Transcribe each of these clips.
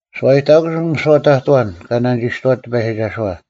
ᓱᐛᔨᑕᑯᓱᐤ ᒥᓯᐛ ᑕᑐᐤ ᐊᐛᓐ ᑲ ᓇᓂᒋᔅᑐᐛᑦ ᑎᐸᔨᒋᒐᓱᐛ;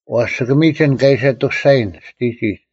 ᐛᔅ ᒋᑭ ᒥᒋᓐ ᑲ ᐃᓯ ᐊᑐᔅᒐᔨᓐ ᒋᑎᒋᒡ: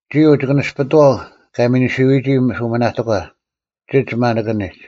ᒋᐅ ᒋᑭ ᓂᔅᐱᑐᐛᐤ ᑲ ᒥᓂᓯᐅᔨᒋ ᓱᒥᓇᑎᒂ ᒋᒡ ᒪᓂᑭᓂᒡ: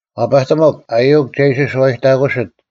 ᐛᐸᑎᒥᒄ, ᐊᔪᐅᒄ ᒐ ᐃᓯ ᓱᐛᔨᑕᑯᓯᑦ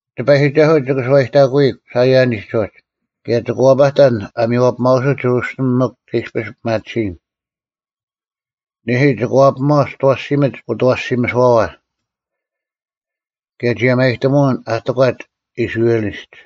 ᑎᐸᔨᒋᒐᓱᐤ ᒋᑭ ᓱᐛᔨᑕᑯᔨᒄ ᓴᐃᔭᓂᒡ ᐅᒋ! ᑭᔭ ᒋᑭ ᐛᐸᑕᓐ ᐊ ᒥᔽᐱᒪᐅᓱᑦ ᒋᕈᓯᓕᒻ ᒥᒄ ᒐ ᐃᔅᐱᔅ ᐱᒪᑎᓯᔨᓐ! ᓂᐦᐃ, ᒋᑭ ᐛᐱᒥᒪᐛ ᒋᑦ ᐊᐛᓯᒥᓯᒡ ᐅᑦ ᐊᐛᓯᒥᓱᐛᐛ! ᑭᔭ ᒋᔭᒪᔨᑎᒧᐅᓐ ᐊ ᑎᒂᒡ ᐃᔅᕋᐃᓕᒡ!